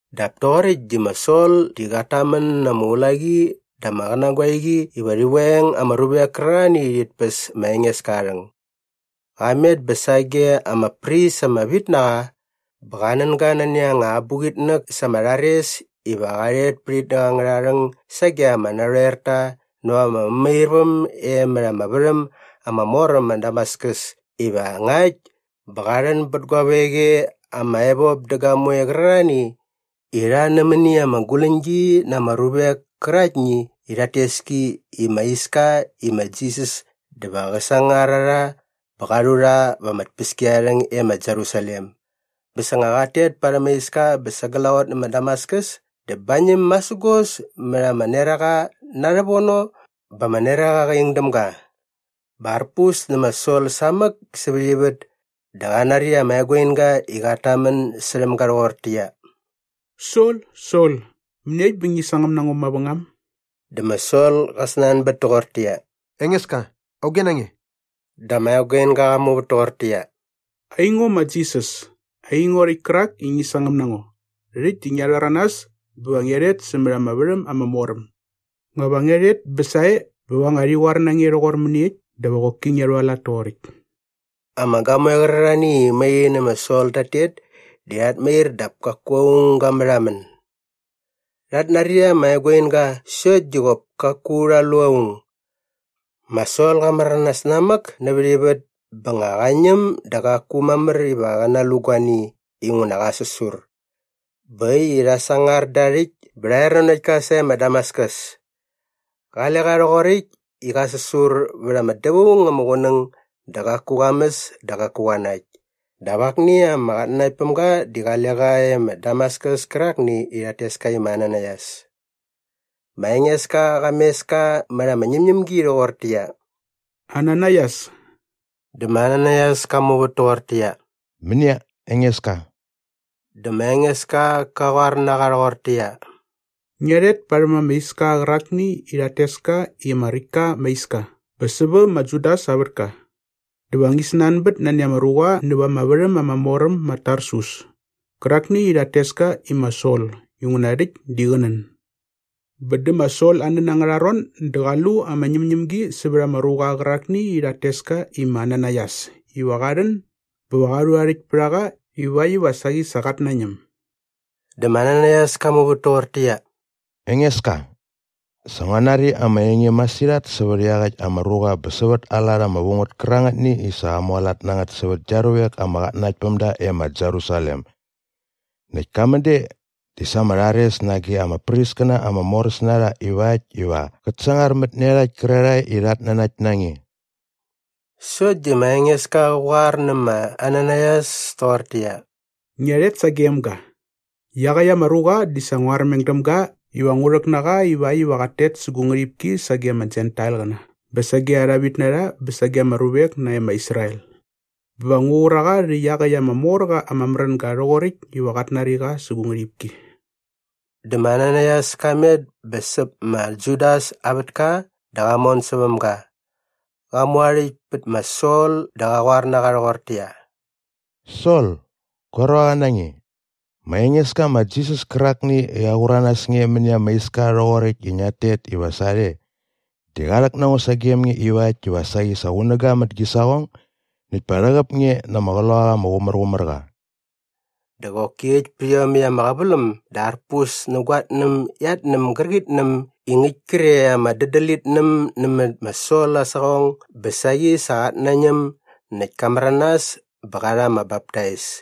Dap toqoräkt di ma Sol di qat tamän na ama ulaqi dä ama qänagoeqi iva rhi veng ama ruvek kärarhani i rhit päs ma Engeska aa rhäng. Qa met bä sage ama pris ama vit na qa bä qa nän ga nani anga abuqitnäk sa ama rhares iva qa rhet pät itnäk angärha rhäng sage ama narhoerta näva ama mämairväm e mät ama värhäm ama mor äm ma Damaskus iva ngakt bä qa rhän bät guavek e ama evop dä gamoe qärarhani i rha nämäni ama guläñgi na ama ruvek käraktni i rhat tes ki i ma Iska i ma Jisas dä va qä sangar a rha bä qa rhu rha va ama tpäskiarharhäng e ma Jerusalem. Bä sa nga qat tet parhäm aa iska bä sa glaqot nä ma Damaskus dä bañäm masägos mät ama neraqa na rhävono bä ama neraqa qa ing däm ga. Bä arpus nä ma Sol samäk sävät ivät dä qa nari ama eguinga i qat tamän särhäm ga rhoqortäqyia, “Sol, Sol, mäniekt bä ngi sangäm na ngo mavängam?” Dä ma Sol qa snanbät toqortäqyia, “Engeska, auge na nge?” Dä ama eguinga qa muvät toqortäqyia, “Aingo ma Jisas, aingo rhäkt kärak i ngi sangäm na ngo. Rhäkt di ngia rhäranas bä va ngia rhet sämät ama värhäm ama mor äm. Nga va ngia rhet bä sae bä va nga rhi qoar na nge rhoqor mäniekt dä va qoki ngia rhualat toqoräkt!” Ama gamoe qärarhani i mai rhi nä ma Sol tat tet di rhat mair dap kaku aung ga märhamän. Rhat nari ama eguinga sokt di qop kaku rha lu aung. Ma Sol qa märanas namäk nävät ivät bä nga qa ñäm dä qaku mamär iva qä nalu guani inguna qa säsur. Bä äkt i rha sangar da aa rhäkt bä rha er nanokt ka sae ma Damaskus. Qale qa rhoqoräkt i qa säsur vät ama dävaung ama qunäng dä qaku qa mäs dä qaku qa nakt. Dap akni ama qatnanaktpämga di qale qa e ma Damaskus kärakni i rhat tes ka i ma Ananaias. Ma Engeska qa mes ka mät ama ñämñämgi rhoqortäqyia, “Ananaias.” Dä ma Ananaias ka muvät toqortäqyia, “Mänia, Engeska?” Dä ma Engeska qa qoar na qa rhoqortäqyia, “Ngia rhet parhäm ama iska qärakni i rhat tes ka i ma Räkt ka ama Iska bä sävä ma Judas aa vätka. Dä va ngi snanbät nani ama ruqa näva ama värhäm ama mor äm ma Tarsus kärakni i rhat tes ka i ma Sol inguna rhäkt di qä nän. Bä dä ma Sol aa nän angärha ron dä qa lu ama ñämñämgi sävät ama ruqa qärakni i rhat tes ka i ma Ananaias iva qa rhän bä qa rhu aa rhäkt pät a qa ivakt iva saqi sa qat nañäm.” Dä ma Ananaias ka muvät toqortäqyia, “Engeska, sa ngua nari ama enge masirhat sävät iaqäkt ama ruqa bä sävät aa lat ama vu ngät kärangätni i sa qa mualat na ngät sävät gia ruvek ama qatnanaktpämda e ma Jerusalem. Näkt ka män de di sa ama rhares nage ama priskäna ama moräs na rha ivakt iva qät sangarmät nä iarhakt kärarhae i rhat nanakt na nge.” Sokt di ma Engeska qä qoar nä ma Ananaias toqortäqyia, “Ngia rhet sagem ga! Iaqäkt ama ruqa di sa ngua armeng däm ga iva ngu rhäk na qa ivakt iva qat tet sä gu ngärhipki sage ama Jentailqäna bä sage arha vitnarha bä sage ama ruvek nae ma Israel. Bä va ngu qur a qa rhä iaqäkt ama mor qa ama märänga rhoqoräkt iva qat nari qa sä gu ngärhipki.” Dä ma Ananaias ka met bä säp ma Judas aa vätka dä qa mon säväm ga. Qa mu aa rhäkt pät ma Sol dä qa qoar na qa rhoqortäqyia, “Sol, gua ruaqa na nge, ma Engeska ma Jisas kärakni i qa qur a nas nge mäni ama iska rhoqoräkt i ngiat tet iva sarhe di qa rhäk na ngo sagem nge ivakt iva saqi sa qunäga mät gi saqong näkt pa rhäqäp nge na ama Qloqaqa ama Qumärqumärqa.” Dä qoki äkt pät iomäkt ama qäväläm dä arpus nä guatnäm iatnäm gärqitnäm i ngäkt kre ama dädälitnäm nämät ma Sol aa saqong bä saqi sa qat nañäm näkt ka märanas bä qa rha ama baptais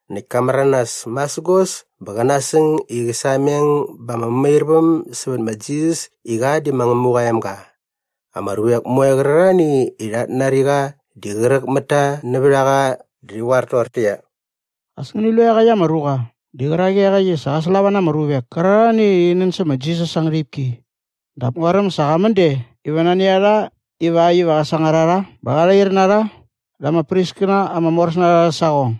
Näkt ka märanas masägos bä qä nasäng i qä sameng ba ama mämairväm sävät ma Jisas i qa di ma Ngämuqa aa emga. Ama ruvek moe qärarhani i rhat nari qa di qräk mät ta nävät a qa dä rhi qoar toqortäqyia, “As ngäni lu i iaqäkt ama ruqa di qärak iaqäkt i sa qä slava na ama ruvek kärarhani i rhi nän sä ma Jisas aa ngärhipki dap nguaräm sa qa män de iva nani a rha ivakt iva qä sangar a rha bä qa rhair na rha da ama priskäna ama moräs na rha arhä saqong.”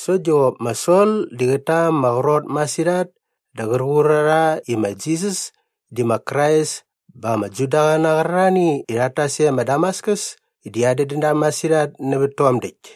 Sokt di qop ma Sol di qät ta ama qrot masirhat dä qär qur a rha i ma Jisas di ma Krais bä ama Judaqäna qärarhani i rhat tas e ma Damaskus di adädän da masirhat nävät tom däkt.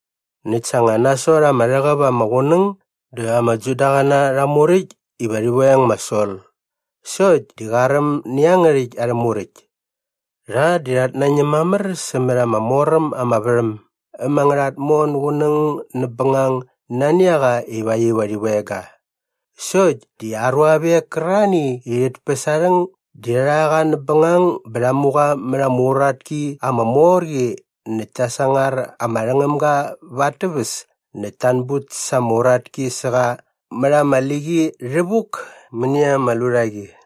Näkt sa nga nasot ama rhäqäp ama qunäng dä ama Judaqäna rha muräkt iva rhi veng ma Sol sokt di qa räm nä iangärhäkt arhä muräkt. Rha di rhat nañäm mamär sämät ama mor äm ama värhäm äm angärha tmon gunäng näp bängang nani a qa ivakt iva rhi veng ga. Sokt di aa ruavek kärarhani i rhit päs aa rhäng di rha rha qa näp bängang bä rha mu qa mät ama uratki ama mor qi näkt ta sangar ama rhängämga va at täväs näkt ta anbut sa ama uratki sä qa mät ama liqi rhävuk mäni ama lurhaqi.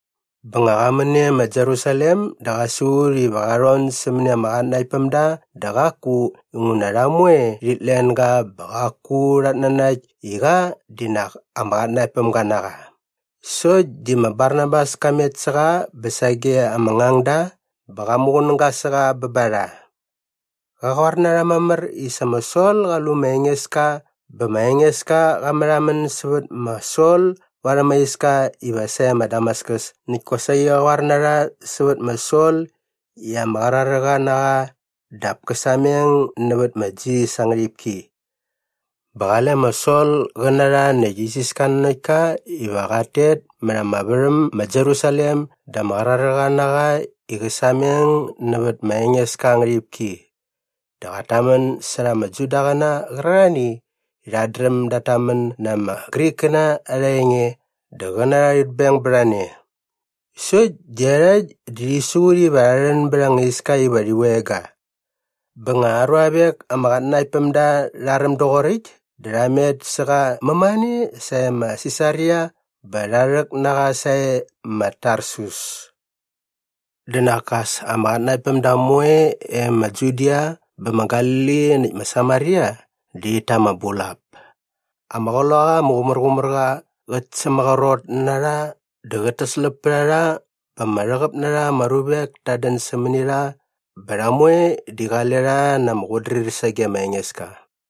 Bä nga qa män e ma Jerusalem dä qa siqut iva qa rhon sämäni ama qatnanaktpämda dä qaku inguna rha moe rhit len ga bä qaku rhat nanakt i qa di nak ama qatnanaktpämga na qa. Sokt di ma Barnabas ka met sä qa bä sage ama ngangda bä qa muqunäga sä qa bä ba rha. Qa qoar na rha mamär i sa ma Sol qa lu ma Engeska bä ma Engeska qa märhamän sävät ma Sol varhäm aa iska iva sae ma Damaskus näkt kosaqi qa qoar na rha sävät ma Sol i ama qraräqa na qa dap kä sameng nävät ma Jisas aa ngärhipki. Bä qale ma Sol qä na rha näkt isiska nanokt ka iva qat tet mät ama värhäm ma Jerusalem dä ama qraräqa na qa i qä sameng nävät ma Engeska aa ngärhipki. Dä qat tamän särha ama Judaqäna qärarhani i rhat dräm dat tamän na ama Grikkäna arha enge dä qä na rha rhit beng bät a ne. Sokt di iarhakt di rhi siqut iva rha rhän bät anga iska iva rhi veng ga. Bä nga aa ruavek ama qatnanaktpämda rha räm doqoräkt dä rha met sä qa mämane sae ma Sisaria bä rha rhäk na qa sae ma Tarsus. Dä nak as ama qatnanaktpämda moe e ma Judia bä ma Galili näkt ma Samaria di rhit ta ama bulap. Ama Qloqaqa ama Qumärqumärqa qät sämaqrot na rha dä qät täsläp pät a rha bä ama rhäqäp na ama ruvek tat dän sämäni rha bä rha moe di qale rha na ama qutdrir sage ma Engeska.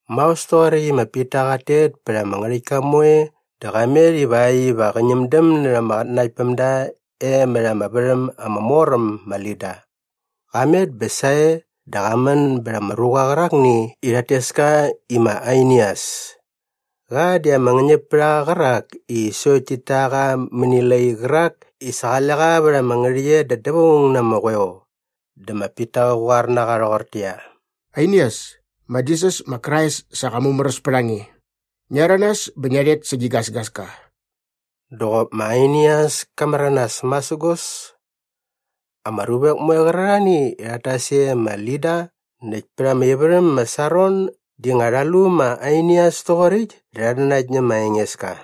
Maos toqoräkt i ma Pita qat tet pät ama ngärhäktka moe dä qa met ivakt iva qä ñämdäm närha ama qatnanaktpämda e mät ama värhäm ama mor äm ma Lida. Qa met bä sae dä qa män bät ama ruqa qärakni i rhat tes ka i ma Ainias. Qa di ama ngäñäpärhaqa qärak i sokt tit ta qa mäni lai qärak i sa qale qa vät ama ngärhäqyet da dävaung na ama qoeo. Dä ma Pita qä qoar na qa rhoqortäqyia, “Ainias, ma Jisas ma Krais sa qa mumäräs pät a nge. Ngia rhäranas bä ngia rhet sä gi gasgaska.” Dä qop ma Ainias ka märanas masägos. Ama ruvek moe qärarhani i rhat tas e ma Lida näkt pät ama ivärhäm ma Saron di nga rha lu ma Ainias toqoräkt dä rhat nanakt nä ma Engeska.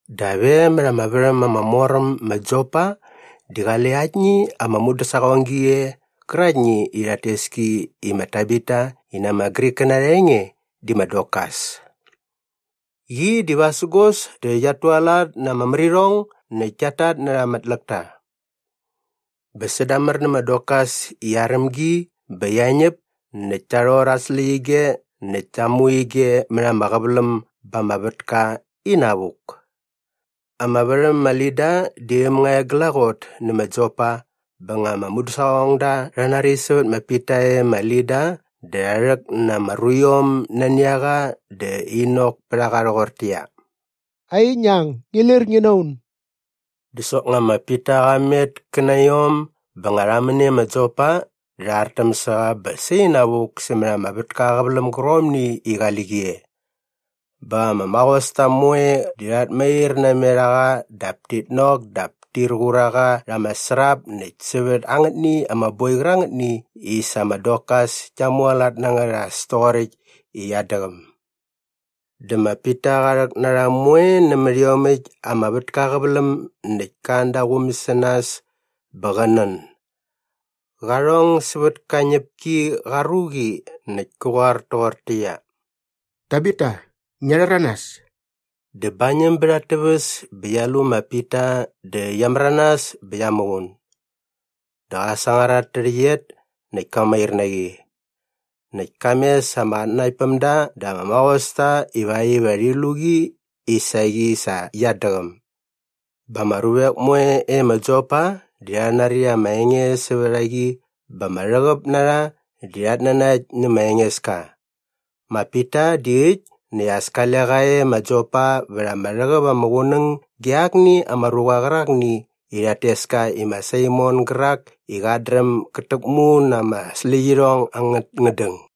Dap e mät ama värhäm ama mor äm ma Jopa di qale aktni ama mudäsaqonggi e qäraktni i rhat tes ki i ma Tabita i na ama Grikkäna arha enge di ma Dorkas. Qi di vasägos dä qiat tualat na ama märirhong näkt kiat tatnärha ama tläkta. Bä sädamär nä ma Dorkas i aräm gi bä qia ñäp näkt ta rhor at släqyige näkt ta mu ige mät ama qäväläm ba ama vätka inavuk. Ama värhäm ma Lida di äm nga e glaqot nä ma Jopa bä nga ama mudäsaqongda rha nari sävät ma Pita e ma Lida dä rha rhäk na ama ruiom nani a qa dä in nok pät a qa rhoqortäqyia, “Ai, ngi ang ngi lir ngi na un.” Dä soknga ma Pita qa met kä na iom bä nga rha män e ma Jopa dä rha artäm sä qa bä sainavuk sämät ama vätka aa qäväläm gärqomni i qali qi e. Bä ama maqosta moe di rhat mair namet a qa dap tit nok dap tir qur a qa rha ama srap näkt sävät angätni ama boi qärangätni i sa ma Dorkas kia mualat na ngät as toqoräkt i qiat däqäm. Dä ma Pita qa rhäk na rha moe nämät iomäkt ama vätka aa qäväläm näkt ka an da aa quum sä nas bä qä nän. Qa rhong sävät ka ñäp ki qa ruqi näkt kä qoar toqortäqyia, “Tabita, ngia rhäranas.” Dä bañäm bät at täväs bä qia lu ma Pita dä qia märanas bä qia muqun. Dä qa sangar at tärhäqyet näkt ka mair na qi. Näkt ka mes ama qatnanaktpämda dä ama maqosta ivakt iva rhi lu qi i saqi sa qiat däqäm. Bä ama ruvek moe e ma Jopa di rha nari ama enge sävät a qi bä ama rhäqäp na rha di rhat nanakt nä ma Engeska. Ma Pita di äkt näkt as kale qa e ma Jopa vät ama rhäqäp ama qunäng ge akni ama ruqa qärakni i rhat tes ka i ma Saimon gärak i qat dräm gät täkmu na ama släqyirhong angät ngädäng.